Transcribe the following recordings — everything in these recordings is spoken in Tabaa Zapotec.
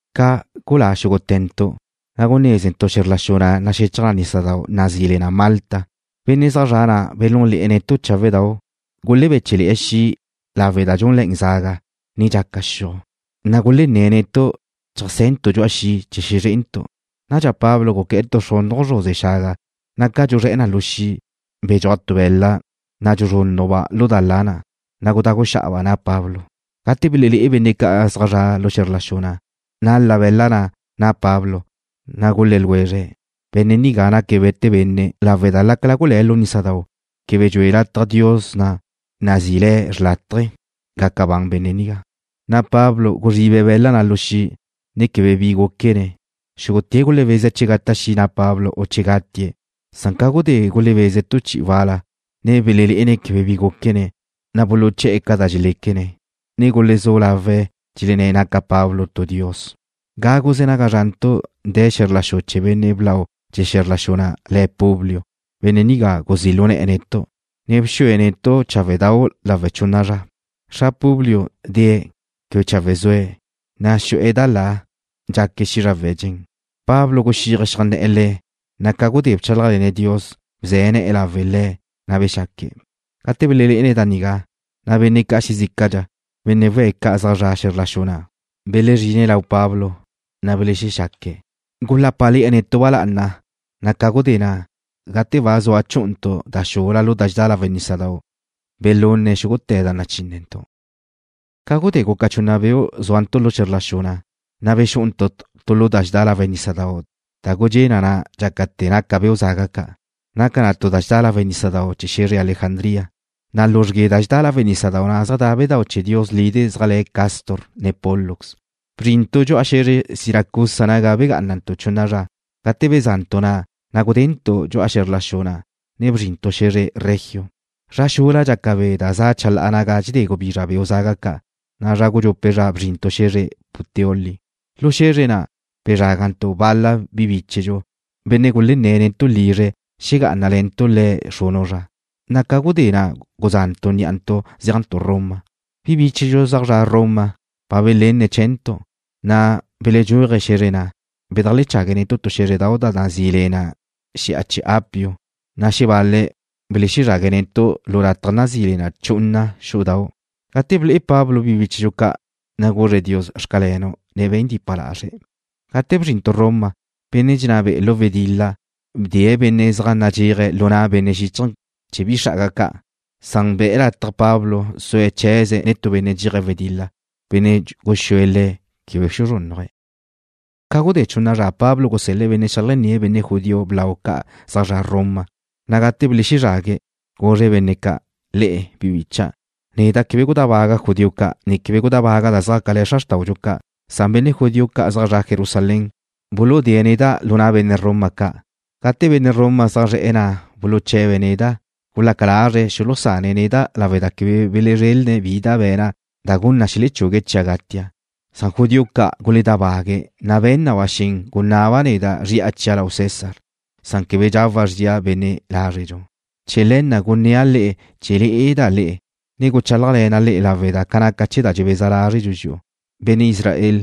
Ca gulá xúgute̱ntu', na' gunézentu' xe̱zr la xu na' da naxechaj nísadau' nazí le na Malta. Benne' zaj zre̱'e̱ na' belúnle̱'e̱ netu' cháwedau'. Gulebéche'le̱'e̱ xi' lawe' da dxúnle̱'e̱ zaga, ne dxaca xiuj, na' gulenné̱' netu' cheajse̱ntu' dxu'a xi' chee̱ xezré'entu'. Nadxa Pablo guqué̱'e̱ tu xrunu zruze xaga, na' ca dxuzré̱'e̱ na lu xi', bedxúaj tu be̱la' da na' dxuzrúnnujba' lu da la na', na' gudagu xa'aba' na' Pablo. Gate belelé'e benne' ca' zaj zre̱'e̱ lu xe̱zr la xu na', nal-la' be̱la' na' na' Pablo, na' gulé̱ ljwezre̱': ―Benne' nigá naque̱' we̱te benne' lawe' da lácala gulé̱' lu nísadau', quebe dxue lataj dios na' nazí'i le̱' Xrlátaje gaca ban le̱'. Pablo guzribe̱' be̱la' na' lu xi', ne quebe bi gúquene̱'. Xúgute̱' gulebeze̱' chee̱ gata' xi' na' Pablo u che'e̱ gatie̱'. Ca gudé gulebeze̱' tu chi'i wal-la, ne belelé'ene̱' quebe bi gúquene̱', na' buluché̱'e̱ ca da dxeléquene̱', ne gulezú lawe̱' dxelenné̱' naca Pablo tu dios. Gágute̱ naga zrantu' de̱ xe̱zr la xu chee̱ benne' blau chee̱ xe̱zr la xu na', le̱' Publio. Benne' nigá guzí' lu ne̱'e̱ netu', ne bxúele̱'e̱ netu' cháwedau' lawe' chunna zra. Xra Publio de̱ze̱', quebe chawe' zue̱', na' xu'e̱ da la, ne dxaque̱' xízrawe̱' dxen. Pablo guxíaje̱' xeajnné̱'e̱ le̱', na' ca gudé bchálajle̱ne̱' Dios, bze̱ ne̱'e̱ lawe' le̱', na' bexaque̱'. Gate belenne̱' da nigá, na' benne' ca' xezícadxa, benne' we̱' ca' zaj zre̱'e̱ xe̱zr la xu na', belezrine̱' lau Pablo, na' belexaque̱'. Gulápale̱'e̱ netu' ba lá'ana, na' ca gudé na', gate ba zua chú'untu' da xula tu lu da dxedá lawe' nísadau', belunne̱' xúgute̱ da nachínnentu'. Ca gudé guca chunna beu' zúantu' lu xe̱zr la xu na', na' bexú'untu' tu lu da dxedá lawe' nísadau' da gudxé' na na' dxácate̱ naca beu' zaga ca'. Naca na tu da dxedá lawe' nísadau' chee̱ xe̱zre Alejandría, na' luzrgue da dxedá lawe' nísadau' na' zaj da bedáu' chee̱ dios bi lide' ca' zaj le̱' Cástor ne Pólux. Bzrintu' dxu'a xe̱zre Siracusa naga begá'anantu' chunna zra. Gate beza'ntu' na', na' gudentu' dxu'a xe̱zr la xu na', ne bzrintu' xe̱zre Regio. Zra xula dxaca be' da za' chalá'a naga dxedé gubizra beu' zaga ca', na' zra gudxupe' zra bzrintu' xe̱zre Puteoli. Lu xe̱zre na' bezrágantu' bal-la bi bíchedxu, benne' gulenné̱' netu' lizre̱' xegá'anale̱ntu' le̱' xrunu' zra, na' ca gudé na' guza'ntu' ní'antu' zéajntu' Roma. Bi bíchedxu zaj zra' Roma ba belenne̱' chee̱ntu', na' beledxúaje̱' xe̱zre na', bedajlechague̱' netu' tu xé̱zredau' nazí le na Xi'a Chee̱ Apio, na' xebal-le̱' belexezrague̱' netu' tu lataj nazí le na Chunna Xú'udau'. Gate ble'e Pablo bi bíchedxu ca', na' guzre̱' Dios: “Xcalenu'”, ne be̱n dipa lazre̱'. Gate bzrintu' Roma, benne' dxenná be'e̱ lu wedil-la bdee̱' benne' zaj nadxéaje̱' lu na' benne' xíchaje̱ chee̱ bi xra'aga ca', san be̱'e̱ lataj Pablo sue̱' chee̱ze̱' nen tu benne' dxéaje̱' wedil-la, benne' guxúe̱' le̱' chee̱ quebe xuzrúnnuje̱'. Ca gudé chunna zra Pablo gusel-le̱' benne' xeajnné̱' benne' judío blau ca' zaj zre̱'e̱ Roma, na' gate belezrague̱', guzre̱' benne' ca': ―Le'e, bi bicha'. Neda' quebe gudábaga' judío ca', ne quebe gudábaga' da xjácale̱ xra xrtáudxu ca', san benne' judío ca' zaj zre̱'e̱ Jerusalén buludée̱' neda' lu na' benne' Roma ca'. Gate benne' Roma zaj zre̱'e̱ na' buluche̱be̱' neda', gulaca lazre̱' xulusane̱' neda' lawe' da quebe belezrelne̱' bi da be̱na' da gun na xelechugue̱' chia' gatia'. Judío ca' guledábague̱', na' be̱n na ba xen gunaba' neda' zri'a chia' lau César. Quebe nacan chee̱ gawa' zria benne' lázredxu. Chee̱ le̱ na' gunnéa' le'e chee̱ le'eda' le'e, ne guchálajle̱na' le'e lawe' da naca ne̱ chee̱ da dxebeza lázredxu dxi'u, benne' Israel,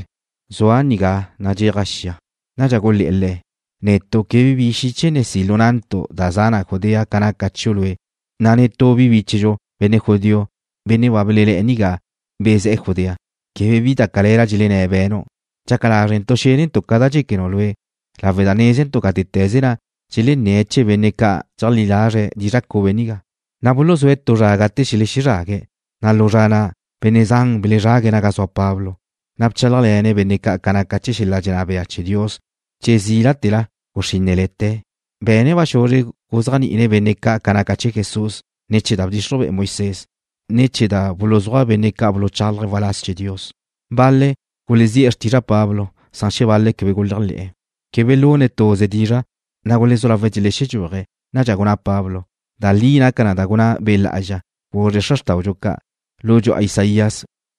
zua' nigá nadxéaja' xia. Nadxa gulé̱'e̱ le̱': ―Netu' quebe bi xiche ne si' lu na'ntu' da za na Judea ca naca chiu' lue', na' netú bi bíchedxu, benne' judío, benne' ba bele̱'e̱ nigá bezé̱'e̱ Judea, quebe bi da cale̱la dxenné̱' be̱nu'. Dxaca lázrentu' xénentu' ca da dxéquenu' lue' lawe' da nézentu' gátete̱ze na' dxelenné̱' chee̱ benne' ca' dxeléajle̱'e̱ dizra' cube nigá. Buluzúe̱' tu zra gate xelexezrague̱', na' lu zra na' benne' zan belezrague̱' naga zua Pablo. Bchálajle̱ne̱' benne' ca' ca naca xel-la' dxenná bea chee̱ Dios che zílate̱la guxrínnele̱te̱. Be̱ne̱' ba xuzre guzéajni'ine̱' benne' ca' ca naca chee̱ Jesús ne̱ chee̱ da bdxixruj be'e Moisés, ne ne̱ chee̱ da buluzúaj benne' ca' buluchálaje̱' waláz chee̱ Dios. Bal-le̱' gulezí'e̱ xrtizra' Pablo, san xebal-le̱' quebe guléajle̱'e̱. Quebe belune̱' tuze dizra', na' gulezú lawe̱' dxelexedxúaje̱'. Nadxa gunná Pablo: ―Da li naca da gunná Be' Lá'azxa, guzre̱' xra xrtáudxu ca' lu dxu'a Isaías,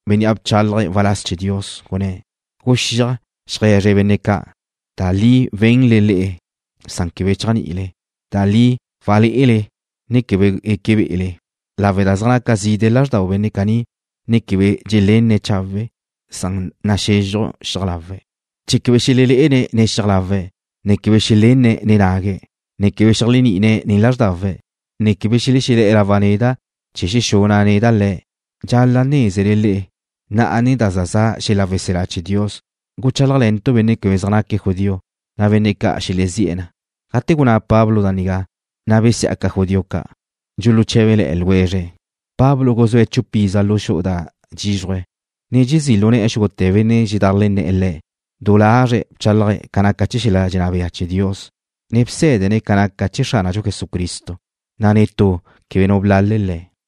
bénnea' bchalaje̱' waláz chee̱ Dios, gunné̱': Guxíaj, xeaje̱zre benne' ca': Da li wenle le'e san quebe chéajni'ile. Da li walé'ele, ne quebe gueque be'ele. Zaj naca zide' lázxdau benne' caní, ne quebe dxelenne̱' chawe'. Zaj naxezxuj xiaj lawe̱' chee̱ quebe xelelé'ene̱' nen xiaj lawe̱', ne quebe xelénene̱' nen nague̱', ne quebe xeléajni'ine̱' nen lázrdawe̱', ne quebe xelexelé̱'e̱ lawa' neda' chee̱ xexuna' neda' le̱'. ’Dxal-la' nézele le'e, na'a ne da za za' xel-la' weselá chee̱ Dios guchálajle̱ntu' benne' quebe zaj naque̱' judío, na' benne' ca' xelezí'e̱ na. Gate gunná Pablo da nigá, na' besiá'aca judío ca', dxuluché̱bele̱'e̱ ljwezre̱'. Pablo guzúe̱' chupa iza lu xu'u da dxízruje̱', ne dxezí' lu ne̱'e̱ xúgute̱ benne' dxedajlenné̱'e̱ le̱'. Du lazre̱' bchálaje̱' ca naca xel-la' dxenná bea chee̱ Dios, ne bsé̱dene̱' ca naca chee̱ Xránadxu Jesucristo, na' netú quebe nu blale̱' le̱'.